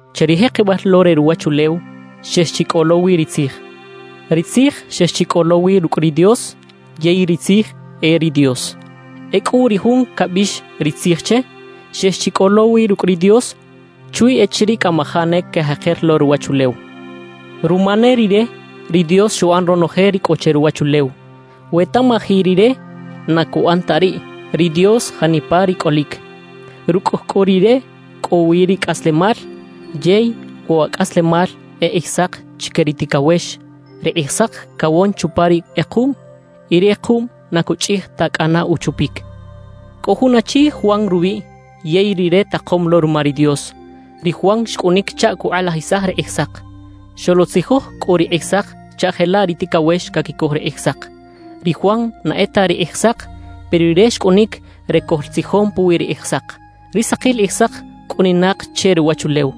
Che ri jekebal lo re ruwachulew, xex chi cꞌo lo wi ri Tzij; ri Tzij xex chi cꞌo lo wi rucꞌ ri Dios yey ri Tzij e ri Dios. Ecꞌu ri Jun cabiꞌx “Ri Tzij” che, xex chi cꞌo lo wi rucꞌ ri Dios chwi echiriꞌ cꞌamajaꞌ ne cajeker lo ruwachulew. Ruma ne Rire, ri Dios xuꞌan ronoje ri cꞌo che ruwachulew. We tamaji Rire, na cuꞌan ta riꞌ ri Dios janipa ri cꞌolic. Rucꞌ cꞌu Rire cꞌo wi ri cꞌaslemal, yey wa cꞌaslemal e Kꞌijsak chique ri ticawex. Ri Kꞌijsak cawon chupa ri kꞌekuꞌm, y ri kꞌekuꞌm na cuchꞌij ta cꞌana uchupic. Cꞌo jun achi Juan rubiꞌ yey rire takom lo ruma ri Dios. Ri Juan xcꞌunic chaꞌ cukꞌalajisaj ri Kꞌijsak. Xoluꞌtzijoj cꞌu ri Kꞌijsak chaꞌ jelaꞌ ri ticawex caquicoj ri Kꞌijsak. Ri Juan na e ta ri Kꞌijsak, pero rire xcꞌunic re coꞌltzijon puwi ri Kꞌijsak. Ri sakil Kꞌijsak cꞌuninak che ruwachulew,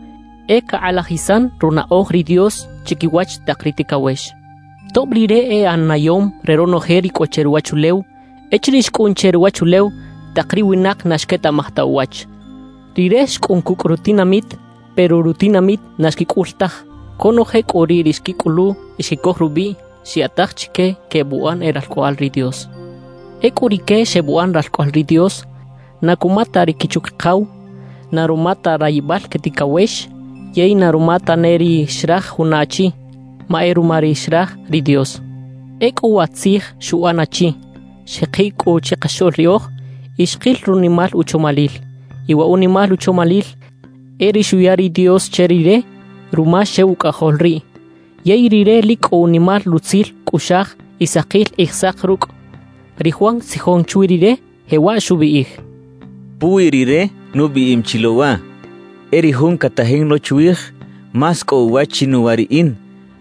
e cakꞌalajisan runaꞌoj ri Dios chiquiwach tak ri ticawex. Tob Rire e ꞌanayom re ronoje ri cꞌo che ruwachulew; echiriꞌ xcꞌun che ruwachulew, tak ri winak na xquetaꞌmaj ta uwach. Rire xcꞌun cucꞌ rutinamit, pero rutinamit na xquicꞌul taj. Conoje cꞌu riꞌ ri xquicꞌulu y xquicoj rubiꞌ, xyaꞌtaj chique quebuꞌan e ralcꞌoꞌal ri Dios. Ecꞌu rique xebuꞌan ralcꞌoꞌal ri Dios, na cuma ta ri quichu-quikaw na ruma ta rayibal que ticawex, yey na ruma tane ri xraj juna achi; ma e ruma ri xraj ri Dios. Ecꞌu wa Tzij xuꞌan achi, xjekiꞌ cꞌu chikaxoꞌl riꞌoj, y xkil runimal uchomalil. Y wa unimal uchomalil e ri xuya ri Dios che Rire ruma xew Ucꞌajol riꞌ, yey Rire lic cꞌo unimal rutzil cꞌuꞌxaj y sakil Kꞌijsak rucꞌ. Ri Juan xtzijon chwi Rire, jewaꞌ xubiꞌij: «Puwi Rire nubiꞌim chi lo waꞌ: E ri Jun catajin lo chwij, más cꞌo uwach chinuwa riꞌin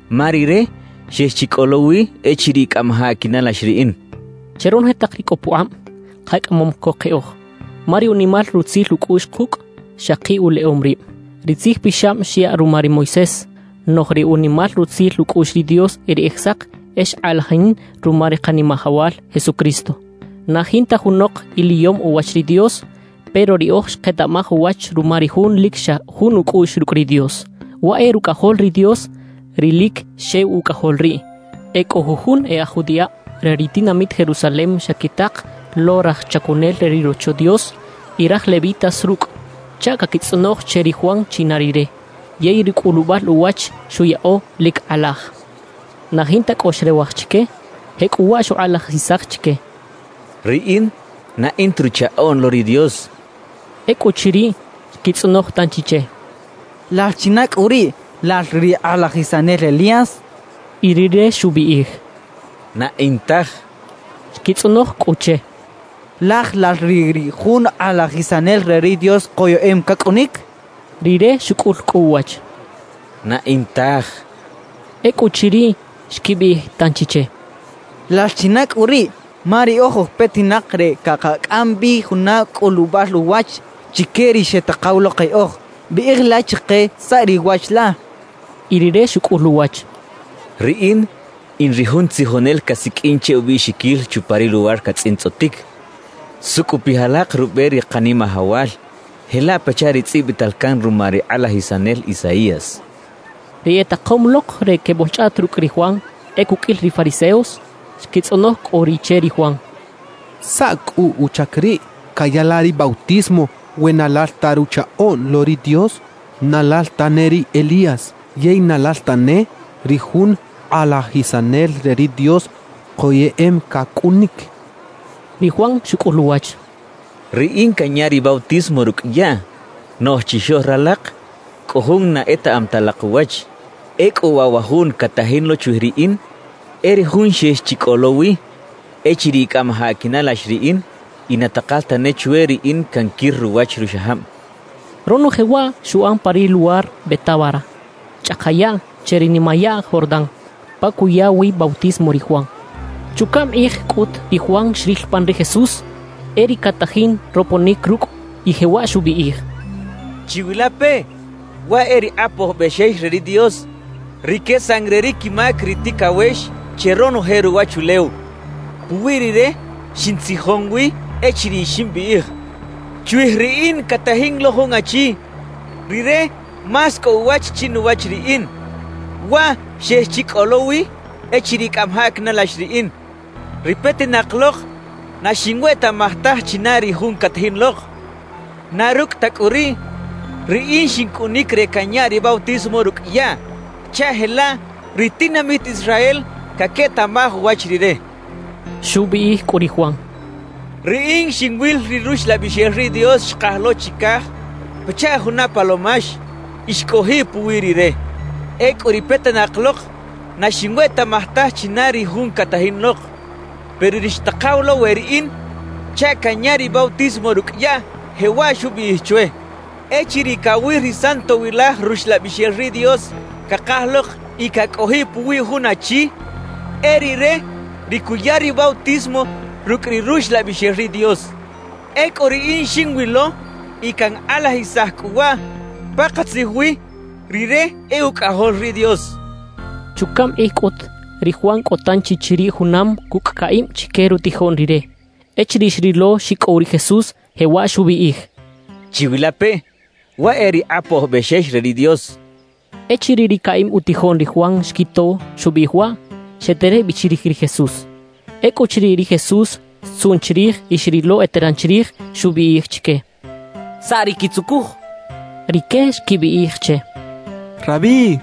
ma Rire xex chi cꞌo lo wi echiriꞌ cꞌamajaꞌ quinalax riꞌin» xchaꞌ. Che ronoje tak ri cꞌo pukꞌab, kacꞌamom co keꞌoj, ma ri unimal rutzil ucꞌuꞌx kucꞌ xaki uleꞌom rib. Ri Tzij Pixab xyaꞌ ruma ri Moisés; noꞌj ri unimal rutzil ucꞌuꞌx ri Dios y ri Kꞌijsak e xkꞌalajin ruma ri Kanimajawal Jesucristo. Na jinta junok iliyom uwach ri Dios; pero riꞌoj xketaꞌmaj uwach ruma ri Jun lic xa jun ucꞌuꞌx rucꞌ ri Dios, waꞌ e Rucꞌajol ri Dios, ri lic xew Ucꞌajol riꞌ. E cꞌo jujun e aj judiꞌab re ri tinamit Jerusalem xequitak lo raj chacunel re ri Rocho Dios y raj levitas rucꞌ, chaꞌ caquitzꞌonoj che ri Juan china rire. Yey ri cꞌulubal uwach xuyaꞌo, lic kꞌalaj; na jinta cꞌo xrewaj chique. Jecꞌuwaꞌ xukꞌalajisaj chique: —Riꞌin na in ta Ruchaꞌoꞌn lo ri Dios —xchaꞌ. Ecꞌuchiriꞌ, xquitzꞌonoj tanchi che: —¿Lal china cꞌu riꞌ? ¿Lal ri kꞌalajisanel Elías? —xechaꞌ. Y rire xubiꞌij: —Na in taj —xchaꞌ. Xquitzꞌonoj cꞌu che: —¿Laj lal riꞌ ri jun kꞌalajisanel re ri Dios koyeꞌem cacꞌunic? —xechaꞌ. Rire xucꞌul cꞌu uwach: —Na in taj —xchaꞌ. Ecꞌuchiriꞌ, xquibiꞌij tanchi che: —¿Lal china cꞌu riꞌ? Ma riꞌoj oj petinak re cakacꞌam bi juna cꞌulubal uwach chique ri xetakaw lo keꞌoj. Biꞌij la chike saꞌ ri wach la —xechaꞌ. Y rire xucꞌul uwach: —Riꞌin in ri jun tzijonel casiqꞌuin che ubiꞌxiquil chupa ri luwar catzꞌintzꞌotic: “Sucꞌupij alak rube ri Kanimajawal” jelaꞌ pachaꞌ ri tzꞌibital can ruma ri kꞌalajisanel Isaías —xchaꞌ. Ri etakom lok re queboꞌlchꞌaꞌt rucꞌ ri Juan, e cuqꞌuil ri fariseos. Xquitzꞌonoj cꞌu riꞌ che ri Juan: —¿Saꞌ cꞌu uchac riꞌ caya la ri bautismo we na lal ta Ruchaꞌoꞌn lo ri Dios, na lal tane ri Elías yey na lal tane ri jun kꞌalajisanel re ri Dios koyeꞌem cacꞌunic? —xechaꞌ. Ri Juan xucꞌul uwach: —Riꞌin canya ri bautismo rucꞌ yaꞌ, noꞌj chixoꞌl ralak cꞌo Jun na etaꞌam ta alak uwach. Ecꞌu waꞌ wa Jun catajin lo chwij riꞌin, e ri Jun xex chi cꞌo lo wi echiriꞌ cꞌamajaꞌ quinalax riꞌin y na takal tane chwe riꞌin canquir ruwach ruxajab —xchaꞌ. Ronoje waꞌ xuꞌan pa ri luwar Betábara, chꞌaka yaꞌ che ri nimayaꞌ Jordán, pa cuya wi bautismo ri Juan. Chucaꞌm kꞌij cꞌut ri Juan xril pan ri Jesús e riꞌ catajin roponic rucꞌ y jewaꞌ xubiꞌij: «Chiwilapeꞌ, waꞌ e ri Kꞌapoj Bexex re ri Dios, ri quesan re ri quimac ri ticawex che ronoje ruwachulew. Puwi rire xintzijon wi echiriꞌ ximbiꞌij: “Chwij riꞌin catajin lo jun achi; rire más cꞌo uwach chinuwach riꞌin. Waꞌ xex chi cꞌo lo wi echiriꞌ cꞌamajaꞌ quinalax riꞌin.” Ri petinak lok na xinwetaꞌmaj taj china ri jun catajin lok; na rucꞌ ta cꞌu riꞌ, riꞌin xincꞌunic re canya ri bautismo rucꞌ yaꞌ, chaꞌ jelaꞌ ri tinamit Israel caquetaꞌmaj uwach rire» xchaꞌ. Xubiꞌij cꞌu ri Juan: «Riꞌin xinwil ri Ruxlabixel ri Dios xkaj lo chicaj pachaꞌ juna palomax y xcꞌojiꞌ puwi rire. Ecꞌu ri petinak lok na xinwetaꞌmaj taj china ri jun catajin lok; pero ri xtakaw lo we riꞌin chaꞌ canya ri bautismo rucꞌ yaꞌ, jewaꞌ xubiꞌij chwe: “Echiriꞌ cawil ri Santowilaj Ruxlabixel ri Dios cakaj lok y cacꞌojiꞌ puwi jun achi, e rire ri cuya ri bautismo rucꞌ ri Ruxlabixel ri Dios.” Ecꞌu riꞌin xinwilo y cankꞌalajisaj cꞌu waꞌ: Pakatzij wi, rire e Ucꞌajol ri Dios» xchaꞌ. Chucaꞌm kꞌij cꞌut, ri Juan cꞌo tanchi chiriꞌ junam cucꞌ caꞌib chique rutijoꞌn rire. Echiriꞌ xrilo xicꞌow ri Jesús, jewaꞌ xubiꞌij: —Chiwilapeꞌ, waꞌ e ri Kꞌapoj Bexex re ri Dios —xchaꞌ. Echiriꞌ ri caꞌib utijoꞌn ri Juan xquito xubiꞌij waꞌ, xeterej bi chirij ri Jesús. Ecꞌuchiriꞌ ri Jesús xtzuꞌn chirij y xrilo eteran chirij, xubiꞌij chique: —¿Saꞌ ri quitzucuj? —xchaꞌ. Rique xquibiꞌij che: —Rabí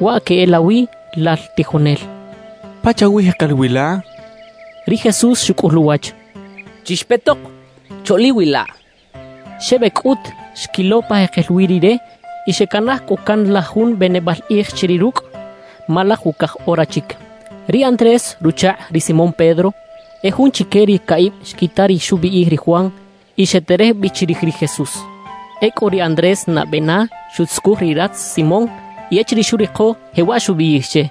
(waꞌ queꞌelawi “lal tijonel”), ¿pachawi jekel wi la? —xechaꞌ. Ri Jesús xucꞌul uwach: —Chixpetok, choꞌliwilaꞌ —xchaꞌ. Xebec cꞌut, xquilo pa jekel wi Rire y xecanaj cꞌu can la jun benebal kꞌij chiriꞌ rucꞌ, ma laj ucaj ora chic. Ri Andrés ruchakꞌ ri Simón Pedro, e jun chique ri caꞌib xquita ri xubiꞌij ri Juan y xeterej bi chirij ri Jesús. Ecꞌu ri Andrés nabe na xuꞌtzucuj ri ratz Simón; y echiriꞌ xuriko, jewaꞌ xubiꞌij che: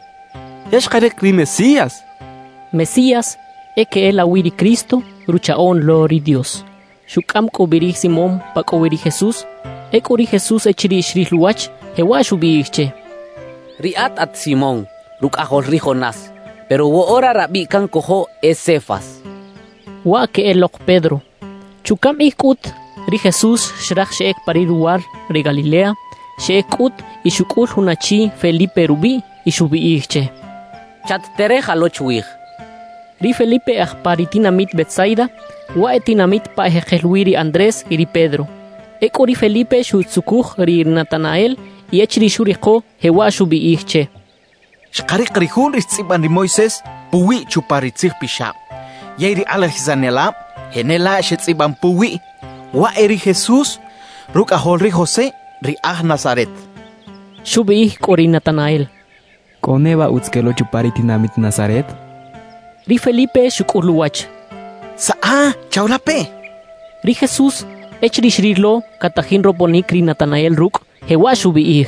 —Ya xkarik ri Mesías —xchaꞌ. (“Mesías” e queꞌelawi ri Cristo, Ruchaꞌoꞌn lo ri Dios.) Xucꞌam cꞌu bi ri Simón pa cꞌo wi ri Jesús. Ecꞌu ri Jesús echiriꞌ xril uwach, jewaꞌ xubiꞌij che: —Riꞌat at Simón, rucꞌajol ri Jonás; pero woꞌora rabiꞌ cancojo e Cefas (waꞌ queꞌelok Pedro) —xchaꞌ. Chucaꞌm kꞌij cꞌut, ri Jesús xraj xeꞌec pa ri luwar re Galilea. Xeꞌec cꞌut y xucꞌul jun achi Felipe rubiꞌ y xubiꞌij che: —Chat-tereja lo chwij —xchaꞌ. Ri Felipe aj pa ri tinamit Betsaida, waꞌ e tinamit pa ejekel wi ri Andrés y ri Pedro. Ecꞌu ri Felipe xuꞌtzucuj ri Natanael y echiriꞌ xuriko, jewaꞌ xubiꞌij che: —Xkarik ri jun ri xtzꞌiban ri Moisés puwiꞌ chupa ri Tzij Pixab, yey ri kꞌalajisanelab jenelaꞌ xetzꞌiban puwiꞌ: Waꞌ e ri Jesús, rucꞌajol ri José ri aj Nazaret —xcha che. Xubiꞌij cꞌu ri Natanael: —¿Cꞌo neba utz quel lo chupa ri tinamit Nazaret? —xchaꞌ. Ri Felipe xucꞌul uwach: —Saꞌa, chawilapeꞌ —xchaꞌ. Ri Jesús, echiriꞌ xrilo catajin roponic ri Natanael rucꞌ, jewaꞌ xubiꞌij: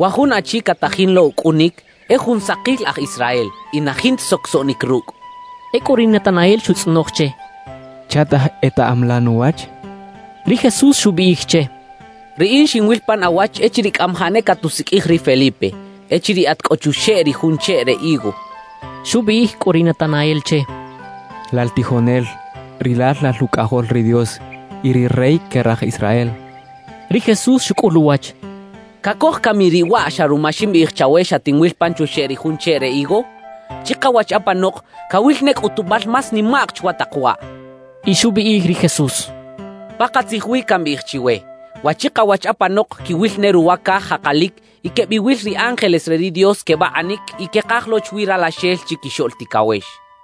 —Wa jun achi catajin lo ucꞌunic, e jun sakil aj Israel y na jinta socosoꞌnic rucꞌ —xchaꞌ. Ecꞌu ri Natanael xutzꞌonoj che: —¿Chaꞌtaj etaꞌam la nuwach? —xchaꞌ. Ri Jesús xubiꞌij che: —Riꞌin xinwil pan awach echiriꞌ cꞌamajaꞌ ne catusiqꞌuij ri Felipe, echiriꞌ at cꞌo chuxeꞌ ri jun cheꞌ re higo —xchaꞌ. Xubiꞌij cꞌu ri Natanael che: —Lal tijonel, rilal lal Ucꞌajol ri Dios y ri Rey que raj Israel —xchaꞌ. Ri Jesús xucꞌul uwach: —¿Cacoj cami riꞌ waꞌ xa ruma ximbiꞌij chawe xatinwil pan chuxeꞌ ri jun cheꞌ re higo? Chikawach apanok, cawil ne cꞌutubal más nimaꞌk chwa tak waꞌ —xchaꞌ. Y xubiꞌij ri Jesús: —Pakatzij wi cambiꞌij chiwe: Wa chikawach apanok quiwil ne ruwa caj jakalic y quebiwil ri ángeles re ri Dios quebakꞌanic y quekaj lo chwi Ralaxel Chiquixoꞌl Ticawex —xchaꞌ.